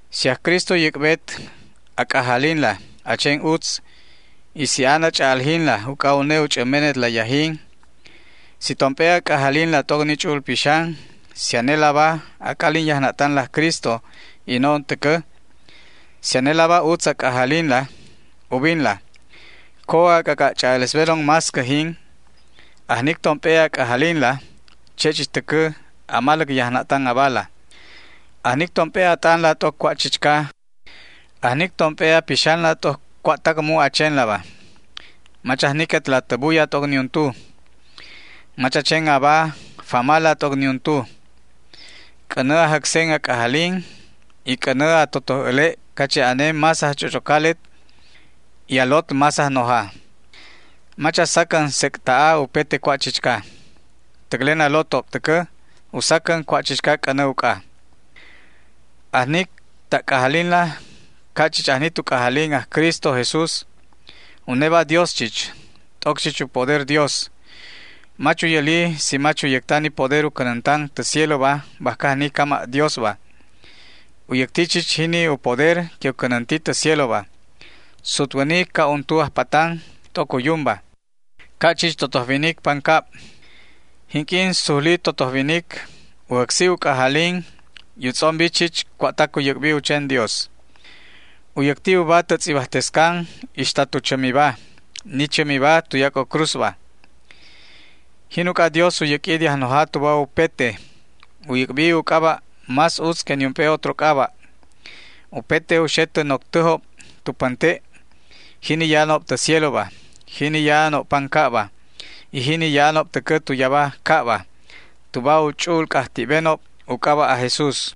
Si aj Cristo u yäc'bet a c'ajalinla a chen utz, si an a ch'a'aljinla uc'a une u ch'ämbetla yajin, si tomp'e a c'ajalinla t'oc ni Ch'u'ul Pixan, si anelaba a c'alin yajna'tan aj Cristo y no'on täcä, si anelaba utz a c'ajalinla, ubinlaba. Co a c'ac'a' ch'a'alesbenon más cäjin, ajnic tomp'e a c'ajalinla, che' chich täcä a maläc yajna'tan abala, ajnic tomp'e a t'anla t'oc cua' chichca, ajnic tomp'e a pixanla t'oc cua'tac mu' a chenlaba. Mach ajniquetla tä buya t'oc niuntu. Mach a chen aba famala t'oc niuntu. C'änä a jäcsen a c'ajalin y c'änä a totoj äle' cache' ane más ajch'och'ocalet y a lot más ajnoja. Mach a sacän sec' ta'a upete cua' chichca. Täclen a lotob täcä u sacän cua' chichca c'änä uc'a. Ajnic ta' c'ajalinla ca' chich ajni tu c'ajalin aj Cristo Jesús. Uneba Dios chich, t'oc chich u poder Dios. Mach u yäli si mach u yäcta ni poder u cänäntan tä cieloba bajca ajni cama' Diosba. U yäcti chich jini u poder que u cänänti tä cieloba. Sutwäni ca' untu ajpatan t'oc u yumba, ca' chich totoj winic pancab. Jinq'uin sujli totoj winic, u jäcsi u c'ajalin y u tz'ombi chich cua'tac u yäc'bi u chen Dios. U yäcti uba tä tz'ibajtescan ixta tu chämiba, ni chämiba tuyac'o cruzba. Jin uc'a Dios u yäq'ui de ajnoja tuba upete, u yäc'bi u c'aba' más utz que niump'e otro c'aba'. Upete u xe tä noctäjob tu pänte', jini ya'anob tä cieloba, jini ya'anob pancabba, y jini ya'anob täcä tu yaba cabba, tuba u ch'u'ul c'ajti'benob u c'aba' aj Jesús.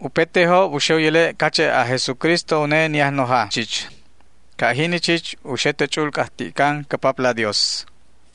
Upetejob u xe u yäle' cache' aj Jesucristo une ni Ajnoja chich. Ca' jini chich u xe tä ch'u'ul c'ajti'can cä Papla Dios.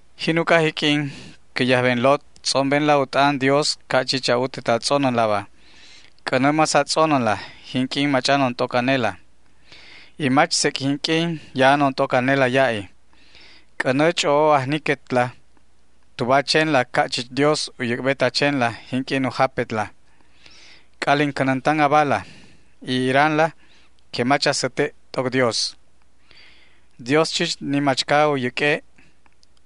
Jin uc'a jiq'uin, cä yajben lot, tz'ombenla u t'an Dios ca' chich a'utet a tz'onänlaba. C'änä más a tz'onänla jinq'uin mach'anon t'oc anela, y mach sec' jinq'uin ya'anon t'oc anela ya'i. C'änä ch'o'o ajniquetla tuba a chenla ca' chich Dios u yäc'bet a chenla jinq'uin u japetla. C'alin cänäntan abala y iranla que mach a säte' t'oc Dios. Dios chich ni machca u yäq'ue'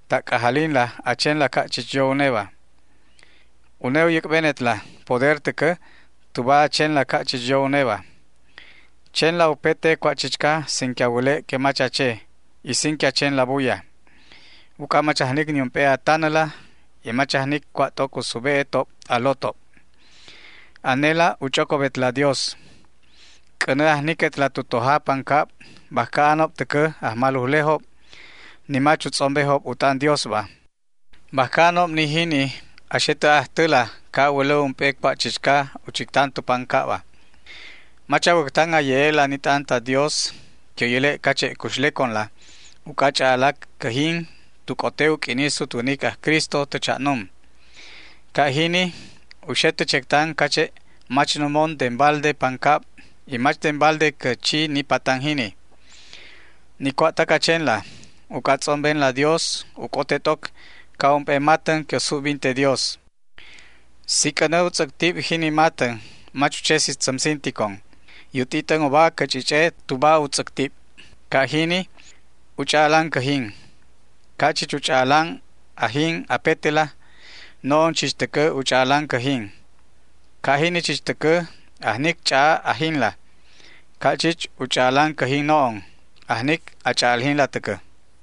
ta' c'ajalinla a chenla ca' chich yo uneba. Une u yäc'benetla poder täcä tuba a chenla ca' chich yo uneba. Chenla upete cua' chichca sin que a wäle' que mach a che, y sin que a chenla buya, uc'a mach ajnic niump'e a tanäla y mach ajnic cua' t'oc u sube'etob a lotob. Anela u ch'ocobetla Dios. C'änä ajniquetla tu toja pancab bajca anob täcä ajmalujlejob ni mach u tz'ombejob u t'an Diosba. Bajca anob ni jini a xe tä ajtäla ca' a wälä ump'e cua' chichca u chictan tu pancabba. Mach a wäctan a ye'e'la ni t'an ta Dios que u yäle' cache' cuxleconla, uc'a ch'a'alac cäjin tu c'ote u q'uini sutwänic aj Cristo tä cha'num. Ca' jini u xe tä chectan cache' mach numon den balde pancab y mach den balde cä chi ni patan jini. Ni cua'tac a chenla uc'a a tz'ombenla Dios u c'ote t'oc ca' ump'e matän que u subbinte Dios. Si c'änä u tz'äctib jini matän mach u che si tzämsinticon y u t'it'än uba cä ch'ich'e tuba u tz'äctib. Ca' jini u ch'a'alan cäjin. Ca' chich u ch'a'alan ajin apetela no'on chich täcä u ch'a'alan cäjin. Ca' jini chich täcä, ajnic ch'a'a ajinla. Ca' chich u ch'a'alan cäjin no'on, ajnic a ch'a'aljinla täcä.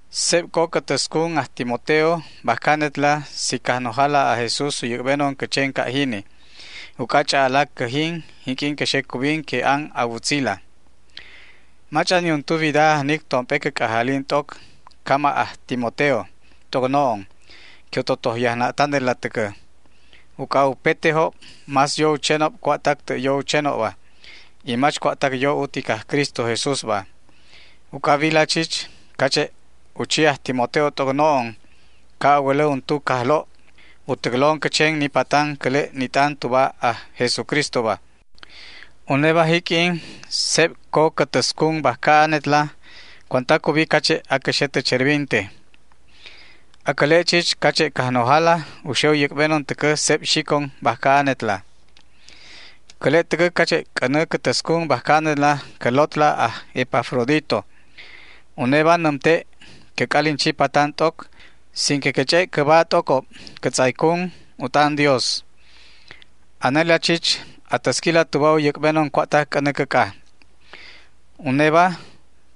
Seb co cä täscun aj Timoteo bajca anetla si Cajnojala aj Jesús u yäc'benon cä chen ca' jini, uc'a ch'a'alac cäjin jinq'uin cä xe cubin que an a wutzila. Mach'an niuntu wida ajnic tomp'e cä c'ajalin t'oc, cama' an aj Timoteo t'oc no'on, que u totoj yajna'tanetla täcä. Uc'a upetejob más yo u chenob cua'tac tä' yo u chenobba, y mach cua'tac yo utic aj Cristo Jesúsba. Uc'a a wila chich cache' u chi aj Timoteo t'oc no'on, ca' a wälä untu cajlo' u täclon cä chen ni patanda cäle' ni t'an tuba aj Jesucristoba. Uneba jiq'uin seb co cä täscun bajca anetla cuanta cubi cache' acä xe tä cherbinte. Acäle' chich cache' Cajnojala u xe u yäc'benon täcä seb xicon bajca anetla. Cäle' täcä cache' c'änä cä täscun bajca anetla cä lotla aj Epafrodito. Uneba nämte' cä c'alin chi patan t'oc sin que cä ch'e' cäba t'ocob cä tz'aycun u t'an Dios. Anela chich a täsquila tuba u yäc'benon cua'tac c'änä cäc'a. Uneba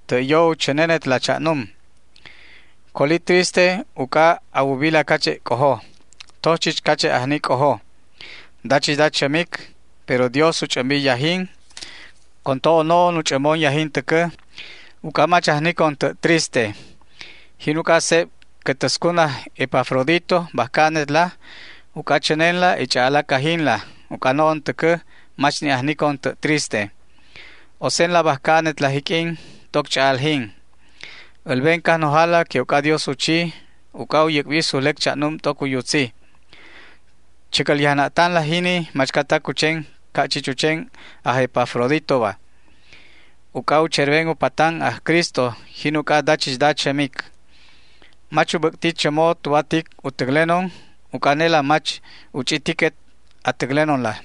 tä' yo u chänenetla cha'num. Colobi triste uc'a a ubila cache' c'ojo. Toj chich cache' ajni c'ojo, dachichda chämic, pero Dios u ch'ämbi yajin. Con to'o no'on u ch'ämbon yajin täcä, uc'a mach ajnicon tä' triste. Jin uc'a seb cä täscun aj Epafrodito bajca anetla, uc'a a chänenla y ch'a'alac ajinla, uc'a no'on täcä mach ni' ajnicon tä' triste. Osenla bajca anetla jiq'uin t'oc ch'a'aljin. Älben Cajnojala que uc'adios u chi uc'a u yäc'bi sujlec cha'num t'oc u yutzi. Chäcäl yajna'tanla jini machcatac u chen ca' chich u chen aj Epafroditoba. Uc'a u cherben u patan aj Cristo, jin uc'a dachichda chämic. Mach u bäc'ti chämo tuba tic u täclenon, uc'a anelaba mach u ch'i tiquet a täclenonla.